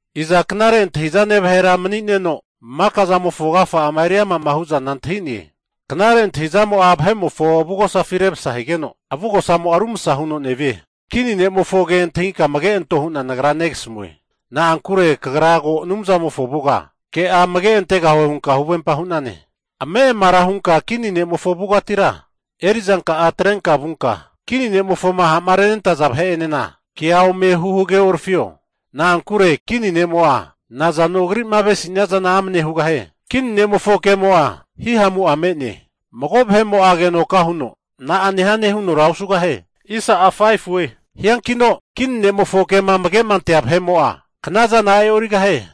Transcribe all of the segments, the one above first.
Iza knare antahi'zane vahera mani'neno, maka zamofo agafa'ama eri ama'ma hu'zana antahine? Knare antahizamo'a vahe'mofo avugosafi remsa higeno, avugosamo'a rumsa huno nevie. Kini ne'mofo ke antahinka amage anto hu'na nagra negasamue. Na'ankure kagra ko Anumzamofo avuga ke'a amage antegahue hunka huvempa hu'nane. Ame'amara hunka kini ne'mofo avugatira eri'zanka'a atrenka vunka kini ne'mofoma ha'ma renentaza vahe'enena kea ome hu hageorafio. Na'ankure kini ne'mo'a nazano agri'ma avesinia zana amane hugahie. Kini ne'mofo kemo'a, hihamu'a me'ne. Mago vahe'mo'a agenoka huno, na'a nehane hunora osugahie. Hiankino kini ne'mofo kema amage'ma antea vahe'mo'a, knazana e'origahie.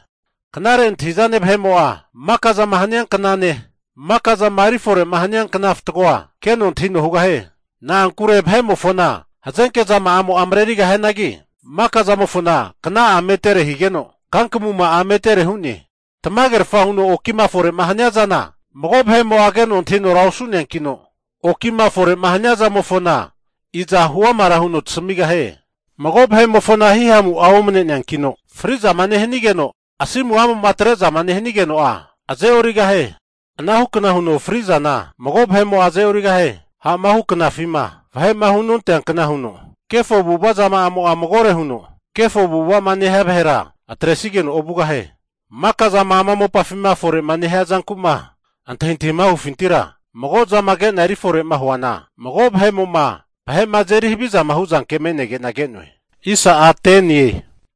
Knare antahi'zane vahe'mo'a maka zama hania knane, maka'zama eri fore'ma hania kna fatgoa keno antahino hugahie. Na'ankure vahe'mofona hazenke zama'amo'a marerigahianagi, maka zamofona kna'a metere higeno kankamuma'a metere hu'ne. Tamagerfa huno okima fore'ma hania zana, mago vahe'mo'a keno antahinora osu'neankino, okima fore'ma hania zamofona, iza huamara huno tasamigahie? Mago vahe'mofona hihamu'a omane'neankino, fri'zama nehanigeno asimu'amo'ma atre'zama nehanigeno'a aze'origahie. Anahu kna huno fri'zana mago vahe'mo'a aze'origahie. Ha'ma hu knafima sondia vahe'ma hunonteankna huno, kefo avu'ava zamo'a magore huno kefo avu'ava'ma nehia vahera atresigeno ovugahie. Maka zama ama mopafima fore'ma nehia zanku'ma antahintahima hufintira, mago zama kena eri fore'ma huana, vahe'mo'ma vahe'ma azeri haviza hu'zanke me'nege'na ke'noe.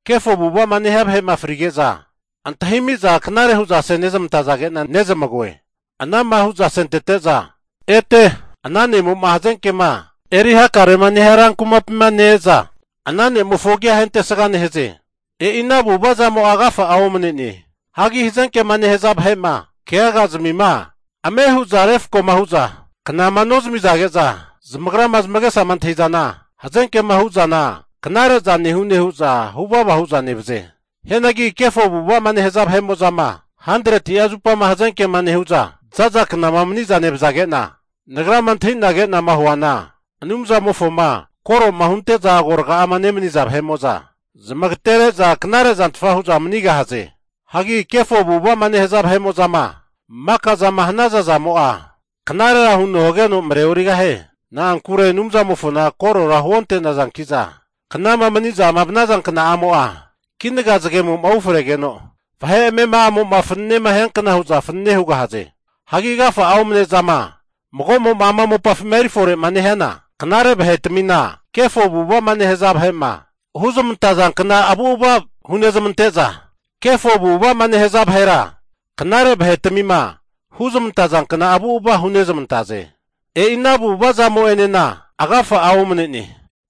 Kefo avu'ava'ma nehia vahe'ma frige'za, antahimi'za knare'za hu'za asezamantazage'na zamage'noe. Ana'ma hu'za asentete'za, ete ana ne'mo'ma hazenkema eri hakarema nehia rankumapima ne-eza, ana ne'mofo agia ahentesga nehaze. E'inahu avu'ava zamo'a agafa'a omane'ne. Hagi hazenkema nehaza vahe'ma keagazmima ame hu'zama refko'ma hu'za knama nozamizage'za, zamagrama zamagesama antahi'zana hazenkema hu'zana knare'za nehune nehu'za huvava huza nevaze. Hianagi kefo avu'ava'ma nehaza vahe'mo'zama 100'a zupama hazenkema nehu'za za'za knama mani'za nevazage'na, nagrama antahi'na ke'nama huana Anumzamofoma koro'ma hunte'za agoraga'ama nemani'za vahe'mo'za zamagatere'za knare zantfa hu'za manigahaze. Hagi kefo avu'ava'ma nehaza vahe'mo'zama maka zama hanaza zamo'a, knarera huno hageno mareorigahie. Na'ankure Anumzamofona korora hunontazanki'za, knama mani'zama vanaza knamo'a kinaga zagemo'ma ufregeno vahe amema'amo'ma fanene nehiankna hu'za fanene hugahaze. Hagi agafa'a omne zama mago'ma ama mopafima eri fore'ma nehiana, knare vahetmina kefo avu'ava'ma nehaza vahe'ma huzmantaza kna avu'ava hunezmante'za, kefo avu'ava'ma nehaza vahera knare vahetmima huzmantaza kna avu'ava hunezmantaze. E'inahu avu'ava zamo'enena agafa'a omne'ne.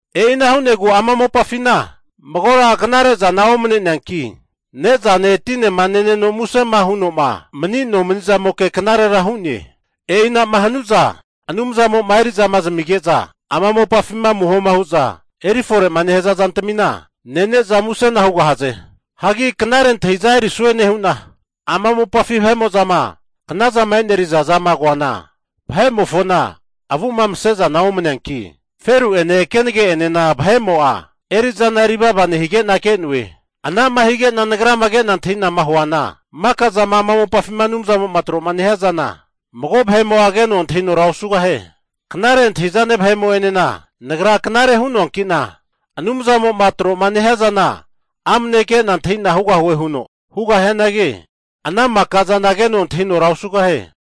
E'ina hu'negu ama mopafina magora knare zana omne'neanki, ne'zane tinema neneno musema huno'ma mani nomani'zamoke knarera hu'ne. E'ina'ma hanu'za Anumzamo'ma eri'zama zamige'za ama mopafima amuhoma hu'za eri fore'ma nehaza zantami nene'za musena hugahaze. Hagi knare antahi'za erisue nehu'na, ama mopafi vahe'mo'zama knazama e'neriza zama koana, vahe'mofona avumase zana omane'neanki, feru'ene kenage'enena vahe'mo'a eri'zana eri vava nehige'na ke'noe. Anama hige'na nagrama ke'na antahi'nama huana, maka zama ama mopafima Anumzamo'ma tro nehia zana, mago vahe'mo'a keno antahinora osugahie. Knare antahi'zane vahe'mo'enena nagra knare hu'noanki'na, Anumzamo'ma tro'ma nehia zana amne ke'na antahina hugahue huno hugahianagi, ana maka zana keno antahinora osugahie.